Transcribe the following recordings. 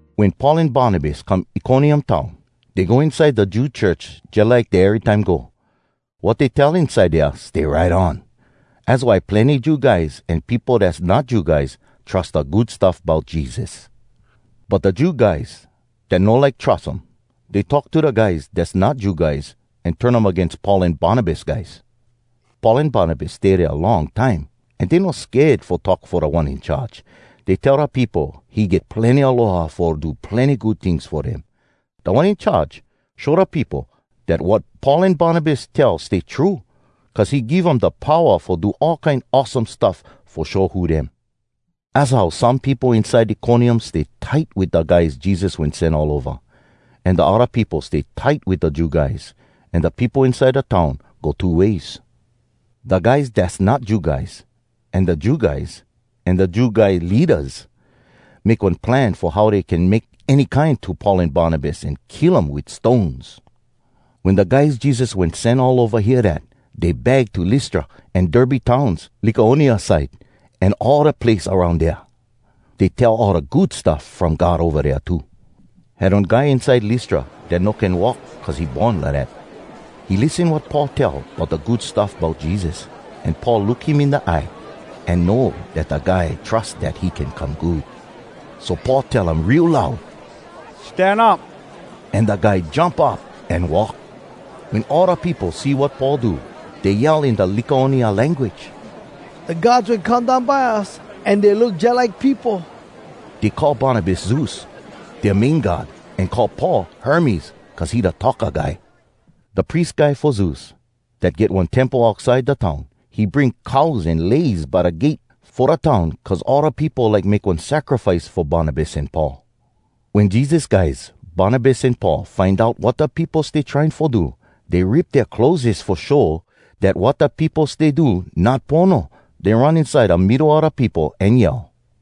Wen Paul an Barnabas come Iconium town, dey go inside da Jew church jalike dey erytime go. Wat dey tell inside dea stay right on. Az why plenny Jew guys an peopo dass not Jew guys trus da Good Stuff Bout Jesus. But da Jew guys dat no like trus um, dey talk to da guys dass not Jew guys an turn um agains Paul an Barnabas guys. Paul an Barnabas stay dea long time an dey no sked fo talk fo Da One In Charge. Dey tell da peopo he get plenny aloha fo do plenny good tings fo dem. Da One In Charge show da peopo dat wat Paul an Barnabas tell stay true, cuz he give um da powa fo do all kine awesome stuff fo show who dem. Az how some peopo inside Iconium stay tight wit da guys Jesus wen sen all ova, an da odda peopo stay tight wit da Jew guys. An da peopo inside da town go two ways. Da guys dass not Jew guys, an da Jew guys, an da Jew guy leadas make one plan fo how dey can make any kine to Paul an Barnabas an kill um wit stones. Wen da guys Jesus wen sen all ova hear dat, dey bag to Lystra an Derbe towns, Lycaonia side, an all da place aroun dea. Dey tell all da Good Stuff From God ova dea too. Had one guy inside Lystra dat no can walk cuz he born lidat. He lissen wat Paul tell bout da Good Stuff Bout Jesus. An Paul look him in da eye, an know dat da guy trus dat he can come good. So Paul tell um real loud, “Stan up!” An da guy jump up an walk. Wen all da peopo see wat Paul do, dey yell in da Lycaonia language, “Da gods wen come down by us, an dey look jalike peopo!” Dey call Barnabas “Zeus,” dea main god, an call Paul “Hermes,” cuz he da talka guy. Da pries guy fo Zeus, dat get one temple outside da town, he bring cows an leis by da gate fo da town cuz all da peopo like make one sacrifice fo Barnabas an Paul. Wen Jesus guys Barnabas an Paul find out wat da peopo stay trying fo do, dey rip dea clotheses fo show dat wat da peopo stay do not pono. Dey run inside da middo a da peopo an yell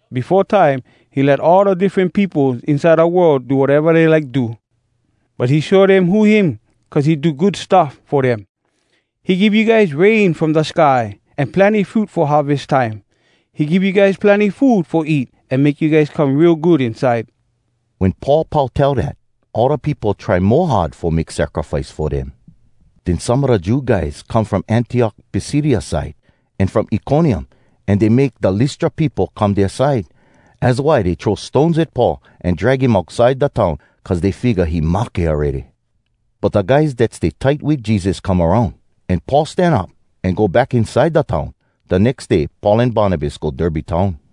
Befo time, he let all da diffren peopos inside da world do wateva dey like do. But he show dem who him cuz he do good stuff fo dem. He give you guys rain from da sky an plenny fruit fo harves time. He give you guys plenny food fo eat an make you guys come real good inside.’” Wen Paul pau tell dat, all da peopo try mo hard fo make sacrifice fo dem. Den some a da Jew guys come from Antiok Pisidia side, an from Iconium, an dey make da Lystra peopo come dea side. Az why dey throw stones at Paul, an drag him outside da town cuz dey figga he mahke awready. But da guys dat stay tight wit Jesus come aroun, an Paul stan up, an go back inside da town. Da nex day Paul an Barnabas go Derbe town.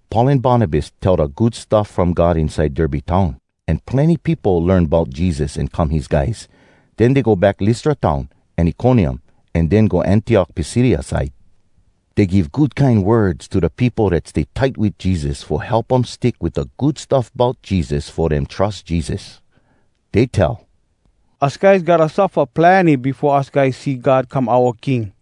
Paul an Barnabas tell da Good Stuff From God inside Derbe town, an plenny peopo learn bout Jesus an come his guys. Den dey go back Lystra town, an Iconium, an den go Antiok Pisidia side. Dey give good kine words to da peopo dat stay tight wit Jesus fo help um stick wit da Good Stuff Bout Jesus fo dem trus Jesus. Dey tell, “Us guys gotta suffa plenny befo us guys see God come oua king.”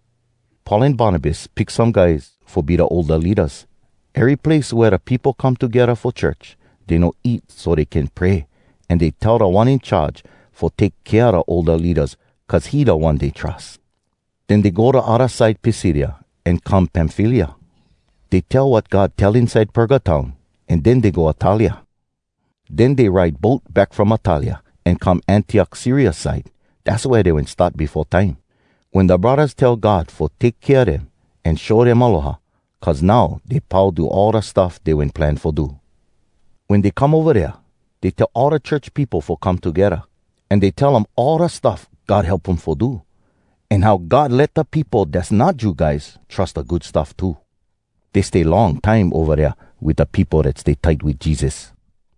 Paul an Barnabas pick some guys fo be da older leadas, ery place wea da peopo come togedda fo church. Dey no eat so dey can pray, an dey tell Da One In Charge fo take kea da older leadas cuz he da One dey trus. Den dey go da odda side Pisidia, an come Pamfylia. Dey tell wat God tell inside Perga town, an den dey go Attalia. Den dey ride boat back from Attalia, an come Antiok Syria side. Dass wea dey wen start befo time, wen da braddahs tell God fo take kea dem an show dem aloha. Cuz now dey pau do all da stuff dey wen plan fo do. Wen dey come ova dea, dey tell all da church peopo fo come togedda, an dey tell um all da stuff God help um fo do, an how God let da peopo dass not Jew guys trus da Good Stuff too. Dey stay long time ova dea wit da peopo dat stay tight wit Jesus.